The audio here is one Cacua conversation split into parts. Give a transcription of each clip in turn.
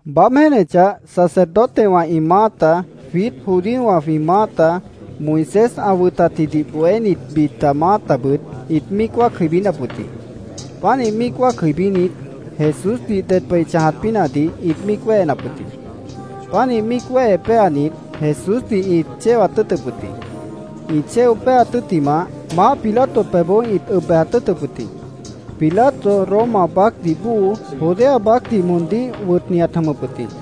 Baáb jéenechah, sacerdotewã ĩ maáta, jwiít judíowã jwĩ maáta, Moisés ã wʉtatjidih bohénit, bita maátabʉt ĩt míic wáac jʉibínap wʉt jĩ. Pánih míic wáac jʉibínit, Jesúsdih ded pah ĩ chãjat pínahdih ĩt míic wéhenap wʉt jĩ. Pánih míic wéhe péanit, Jesúsdih ĩt chéwat tʉ́ʉtʉp wʉt jĩ. Ĩ chéo péaat tʉ́ttimah, maáh Pilato pebhboó ĩt ʉb bejat tʉ́ʉtʉp wʉt jĩ. Pilato, Roma baácdih bóo, Judea baácdih moondíh wʉtni ãt jʉmʉp wʉt jĩ.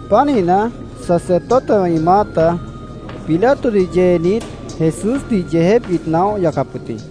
Pánihna, sacerdotewã ĩ maáta Pilatodih yeenit, Jesúsdih yeejép ĩt naóh yacap wʉt jĩ.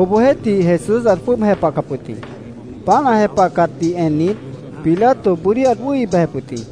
Obohjeéhtih, Jesús ãt jwʉ́ʉb jepahcap wʉt jĩ. Páant ã jepahcatdih ennit, Pilato bʉ́dí ãt wʉ́hi bejep wʉt jĩ.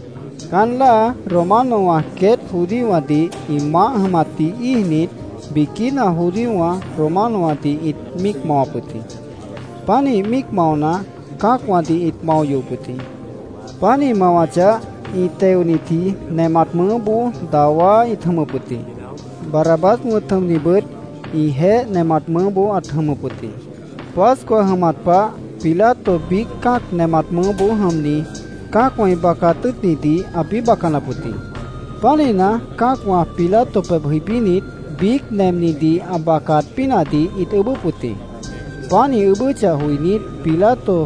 Caán láa, Romanowã queét judíowãdih ĩ maáh jʉmatdih íijnit, biquína judíowã Romanowãdih ĩt míic mawap wʉt jĩ. Pánih míic maona, cã́acwãdih ĩt mao yohop wʉt jĩ. Páant ĩ mawachah, ĩ teonitji nemat mʉʉ́boó dawá ĩt jʉmʉp wʉt jĩ. Barrabás wʉ̃t jʉmnibʉt ĩjeéh nemat mʉʉ́boó ãt jʉmʉp wʉt jĩ. Pascua jʉmat pah Pilato biíc cã́ac nemat mʉʉ́boó jʉmni, cã́acwã ĩ bacaat tʉ́ʉtnidih ãpĩ́ bacanap wʉt jĩ. Pánihna, cã́acwã Pilato pebh jʉibínit, biíc nemnidih ã bacaat pínahdih ĩt ʉʉ́bʉ́p wʉt jĩ. Páant ĩ ʉʉ́bʉ́chah joinít, Pilato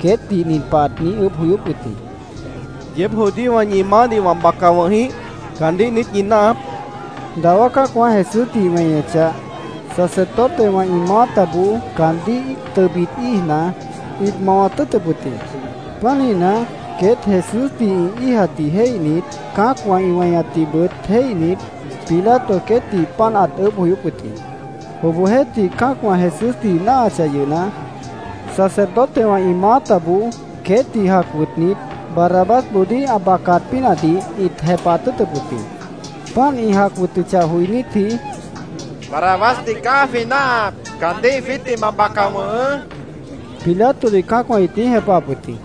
queétdih nin pah ãt niíj ʉʉ́bh joyóp wʉt jĩ: —¿Yeéb judíowã ñi maáhdih wã baca wʉ̃h jĩíh? ¿Caandíh niít ñi náahap? ãt niijíp wʉt jĩ. Dawá cã́acwã Jesúsdih ĩ weñechah, sacerdotewã ĩ maátaboó caandíh tʉbit íijna, ĩt mawat tʉ́ʉtʉp wʉt jĩ. Pánihna, queét Jesúsdih ĩ íijatdih jéihnit, cã́acwã ĩ weñatdihbʉt jéihnit, Pilato queétdih páant ãt ʉʉ́bh joyóp wʉt jĩ. Obohjeéhtih, cã́acwã Jesúsdih ĩ náahachah yʉhna, sacerdotewã ĩ maátaboó queétdih jac wʉtnit, Barrabásboodíh ã bacaat pínahdih ĩt jepahat tʉ́ʉtʉp wʉt jĩ. Páant ĩ jac wʉtʉchah joinítji, —¡Barrabásdih caá jwĩ náahap! ¡Caandíh jwiítdih ma baca wʉ̃hʉʉ́! Pilatodih cã́acwã ĩt niíj jepahap wʉt jĩ.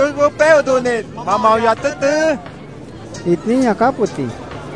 —¡Caandíh cruzboó péoh dodhnit, ma mao yohat tʉ́ʉtʉ́! ĩt niíj ñaacáp wʉt jĩ.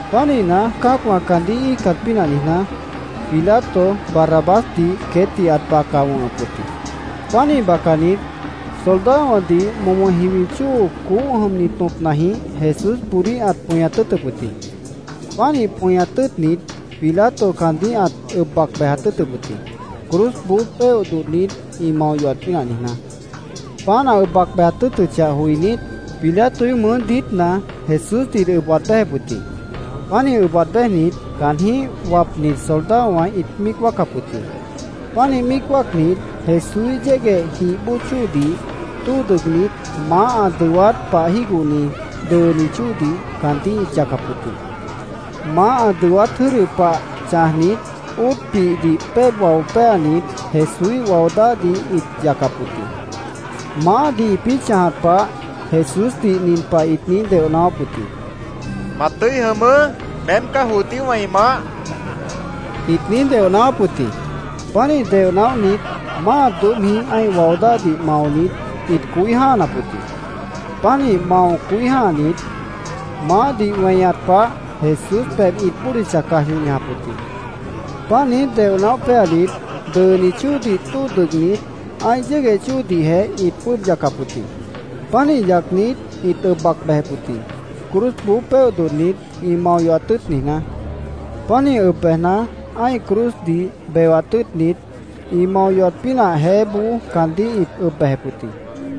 Pánihna, cã́acwã caandíh ĩ íijcat pínah niijná, Pilato Barrabásdih queétdih ãt baca wʉ̃hʉp wʉt jĩ. Pánih bacanit, soldadowãdih momo jiwi chóo coóh jʉmni tõpnajĩh Jesúsboodíh ãt pʉñat tʉ́ʉtʉp wʉt jĩ. Pánih pʉñat tʉ́ʉtnit, Pilato caandíh ãt ʉb bejat tʉ́ʉtʉp wʉt jĩ, cruzboó péoh dodhnit, ĩ mao yohat pínah niijná. Páant ã ʉb bejat tʉ́ʉtʉchah joinít, Pilatoíh mʉʉ́ diítna Jesúsdih ĩt ʉb waad béjep wʉt jĩ. Pánih ʉb waad béjnit, caanjĩ́h wapnit soldadowã ĩt míic wáacap wʉt jĩ. Pánih míic wáacnit, Jesúíh yégueh jih bóo chóodih tóo dʉgnit, maáh ã dʉwát pah jígohni dʉʉni chóodih caandíh ĩt yacap wʉt jĩ. Maáh ã dʉwát jʉ́dʉ pah chãjnit, óot pihdih péeb wao péanit, Jesúíh wao dáhdih ĩt yacap wʉt jĩ. Maáhdih ĩpĩ́ chãjat pah Jesúsdih nin pah ĩt niíj deoh naáwáp wʉt jĩ: —¡Ma tʉ́i jʉmʉʉ́! ¡Meém caá judíowã ĩ maáh! ĩt niíj deoh naáwáp wʉt jĩ. Pánih deoh naóhnit, máa doóbhjĩh ã́ih wao dáhdih maonit, ĩt coí jã́hanap wʉt jĩ. Pánih mao coí jã́hanit, maáhdih weñat pah Jesús pebh ĩt bódicha caj yoh ñajap wʉt jĩ. Páant niíj deoh naóh péanit, dʉʉni chóodih tóo dʉgnit, ã́ih yégueh chóodihjeh ĩt jwʉ́ʉb yacap wʉt jĩ. Pánih yacnit, ĩt ʉb bac bejep wʉt jĩ, cruzboó péoh dodhnit, ĩ mao yohat tʉ́ʉt niijná. Pánih ʉb bejna, ã́ih cruzdih bewat tʉ́ʉtnit, ĩ mao yohat pínah jeéboó caandíh ĩt ʉb bejep wʉt jĩ.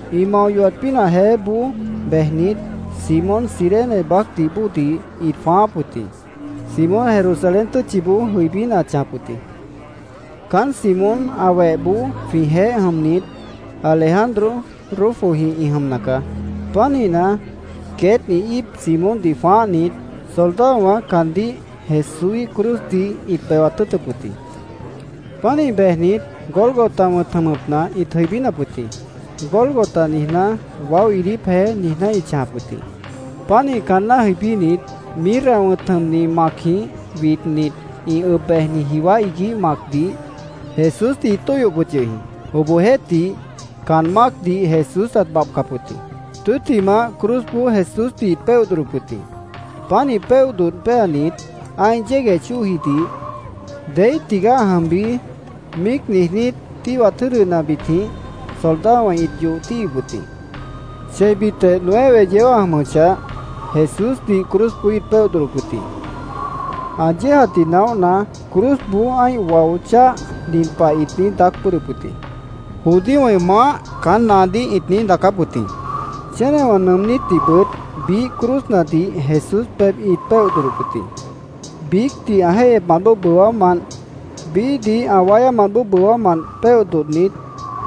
Ĩ mao yohat pínah jeéboó bejnit, Simón, Cirene baácdih bóodih ĩt jwãááp wʉt jĩ. Simón Jerusalén tʉ́tchiboó jʉibína ãt chãjap wʉt jĩ. Caán Simón ã wehboó jwĩjeéh jʉmnit Alejandro, Rufojĩh ĩ jʉmna caá. Pánihna, queét ĩ íip Simóndih jwãáhnit, soldadowã caandíh Jesúíh cruzdih ĩt bewat tʉ́ʉtʉp wʉt jĩ. Pánih bejnit, Gólgota wʉ̃t jʉmʉpna ĩt jʉibínap wʉt jĩ. “Gólgota” niijná, “Waó Iidíp jeé”, niijná ĩt chãjap wʉt jĩ. Pánih caanná jʉibínit, mirra wʉ̃t jʉmni macjĩh widnit, ĩ ʉb bejni jiwá iguíh macdih Jesúsdih ĩt tóihyop wʉt yʉh jĩ. Obohjeéhtih, caan mácdih Jesús ãt babhcap wʉt jĩ. Tʉ́ttimah, cruzboó Jesúsdih ĩt péoh dodhdop wʉt jĩ. Pánih péoh dodh péanit, ã́ih yégueh chóojidih “¿Deíh tigaá ã jʉmbi?” míic niijnít, tíhwat jʉ́dʉnabitjĩh soldadowã ĩt yoh tíhwip wʉt jĩ. Cheibitjeh nueve yeó ã jʉmʉchah, Jesúsdih cruzboó ĩt péoh dodhdop wʉt jĩ. Ã yéejatdih naóhna, cruzboó ã́ih wao cháh, nin pah ĩt niíj daác bʉ́ʉdhdʉp wʉt jĩ. “Judíowã ĩ maáh”, caán naadíh ĩt niíj daacáp wʉt jĩ. Chénewã nʉʉmnítdihbʉt biíh cruznadih Jesús pebh ĩt péoh dodhdop wʉt jĩ. Biícdih ã jéihyepmant bóo bʉwámant, biíhdih ã wáyámant bóo bʉwámant péoh dodhnit,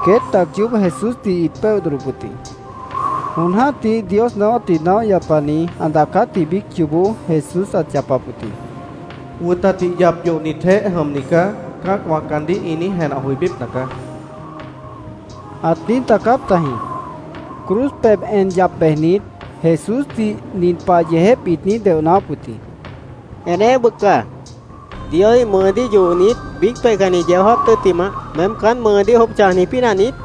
queét tac yoób Jesúsdih ĩt péoh dodhdop wʉt jĩ. Jon jã́tih Dios naáwátdih naóh yapani ã daacátji biíc yoobó Jesús ãt yapap wʉt jĩ: “ ‘Wʉtatdih yap yohnitjeéh jʉmni caá’, cã́acwã caandíh ĩ niíj jenah joibípna caá”, ãt niíj daacáp tajĩ. Cruz pebh en yap bejnit Jesúsdih nin pah yeejép ĩt niíj deoh naáwáp wʉt jĩ: —¡Eneéh bʉca! ¿Dioíh mʉʉdíh yohnit, biíc peihcanni yeó jáap tʉ́ttimah, meém caán mʉʉdíh jwʉ́ʉb chãjni pínah niít?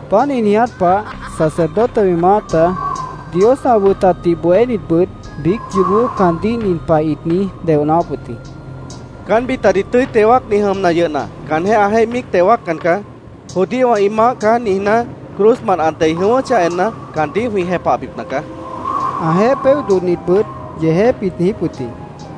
Páant ĩ niiját pah sacerdotewã ĩ maáta, Dios ã wʉtatdih bohénitbʉt biíc yoobó caandíh nin pah ĩt niíj deoh naáwáp wʉt jĩ: —Caán bitadih tʉ́i teo wáacni jʉmna yʉhna, caanjéh ã jéih míic teo wáaccan caá. ‘Judíowã ĩ maáh caá’, niijná, cruzmant ã dei jʉ̃ʉ́wʉ́chah enna, caandíh jwĩ jepahbipna caá, ĩt niijíp wʉt jĩ. Ãjeéh ĩ péoh dodhnitbʉt yeejép ĩt niijíp wʉt jĩ.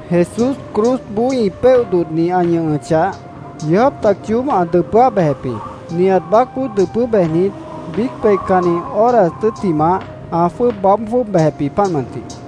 Jesús cruzboó ĩ péoh dodhni ã ñʉhʉchah, yeó jáap tac yoób ã dʉpʉ́áh bejep jĩ. Nihat baácboó dʉpʉ́ bejnit, biíc peihcanni horas tʉ́ttimah, ã jwʉ́ʉb baáb jwʉ́ʉb bejep jĩ, páant mʉntih.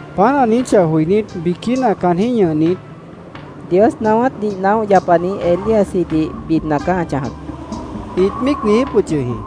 Páant ã niijíchah joinít, biquína caanjĩ́h ñʉhnit, —Dios naáwátdih naóh yapani Elíasjidih bidna caá ã chãjap, ĩt míic niijíp wʉt yʉh jĩ.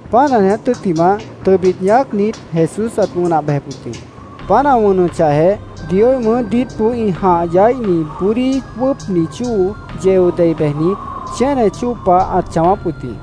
Páant ã niiját tʉ́ttimah, tʉbit ñaácnit, Jesús ãt wʉnah bejep wʉt jĩ. Páant ã wʉnʉchahjeh, Dioíh mʉʉ́ diítboó ĩ jãh yaíhni bʉ́dí wʉ́ʉpni chóo yeo dei bejnit, chéne chóo pah ãt chãwáp wʉt jĩ.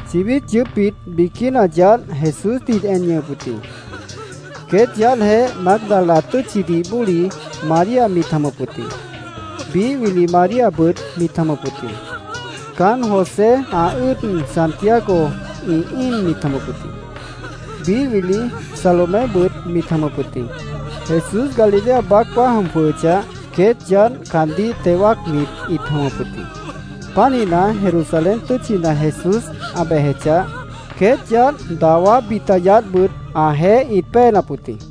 Chibít yʉʉ́pbit biquína yaádh Jesúsdih ĩt en ñʉhʉp wʉt jĩ. Queét yaádhjeéh Mágdala tʉ́tchidih bóli María mit jʉmʉp wʉt jĩ. Biíh wili Maríabʉt mit jʉmʉp wʉt jĩ. Caánt José, ã ʉ́ʉd Santiago ĩ íin mit jʉmʉp wʉt jĩ. Biíh wili Salomébʉt mit jʉmʉp wʉt jĩ. Jesús Galilea baácboó ã jʉm jwʉhʉchah, queét yaádh caandíh teo wáacnit ĩt jʉmʉp wʉt jĩ. Pánihna, Jerusalén tʉ́tchina Jesús ã bejechah, queét yaádh dawá bita yaádhbʉt ãjeéh ĩt péenap wʉt jĩ.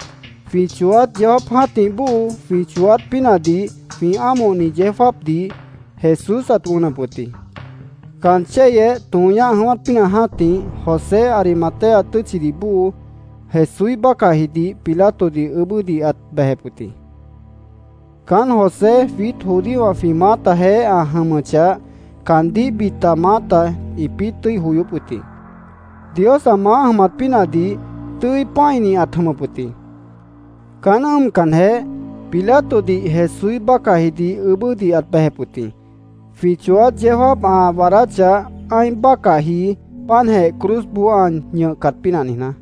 Jwĩ chooát yeó jáap jã́tih bóo, jwĩ chooát pínahdih jwĩ ámohni yeó jáapdih, Jesús ãt wʉnʉp wʉt jĩ. Caan chéyeh tõo ñáh jʉ̃ʉ́wát pínah jã́tih, José, Arimatea tʉ́tchidih bóo, Jesúíh bácahjidih Pilatodih ʉʉ́bʉ́dih ãt bejep wʉt jĩ. Caán José jwiít judíowã jwĩ maátajeéh ã jʉmʉchah, caandíh bita maáta ĩpĩ́ tʉ́i joyóp wʉt jĩ. Dios ã maáh jʉmat pínahdih tʉ́i pã́ini ãt jʉmʉp wʉt jĩ. Caán ʉ́ʉmcanjeh, Pilatodih Jesúíh bácahjidih ʉʉ́bʉ́dih ãt bejep wʉt jĩ, jwĩ chooát yeó jáap ã waadáchah, ã́ih bácahji páantjeh cruzboó ã ñʉhcat pínah niijná.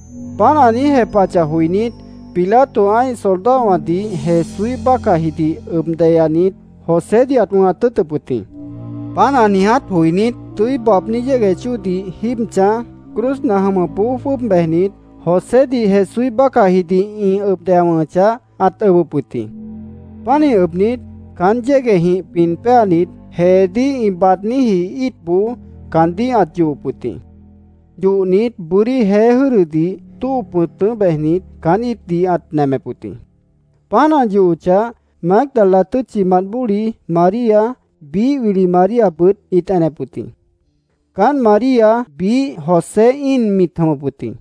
Páant ã niíj jepahachah joinít, Pilato ã́ih soldadowãdih Jesúíh bácahjidih ʉb deyanit, Josédih ãt wʉ̃hat tʉ́ʉtʉp wʉt jĩ. Páant ã niiját joinít, tʉ́i baabní yégueh chóodih jíib chãj, cruzna jʉmʉpboó jwʉ́ʉb bejnit, Josédih Jesúíh bácahjidih ĩ ʉb deya wʉ̃hʉchah, ãt ʉbʉp wʉt jĩ. Pánih ʉbnit, caán yéguehjĩh pin péanit, jeedíh ĩ baadníji íitboó caandíh ãt yohop wʉt jĩ. Yohnit, bʉ́dí jeé jʉ́dʉdih tóo pʉ̃tʉ́ bejnit, caán íitdih ãt nemep wʉt jĩ. Páant ã yohochah, Mágdala tʉ́tchimant bóli María, biíh wili Maríabʉt ĩt enep wʉt jĩ. Caánt María biíh José íin mit jʉmʉp wʉt jĩ.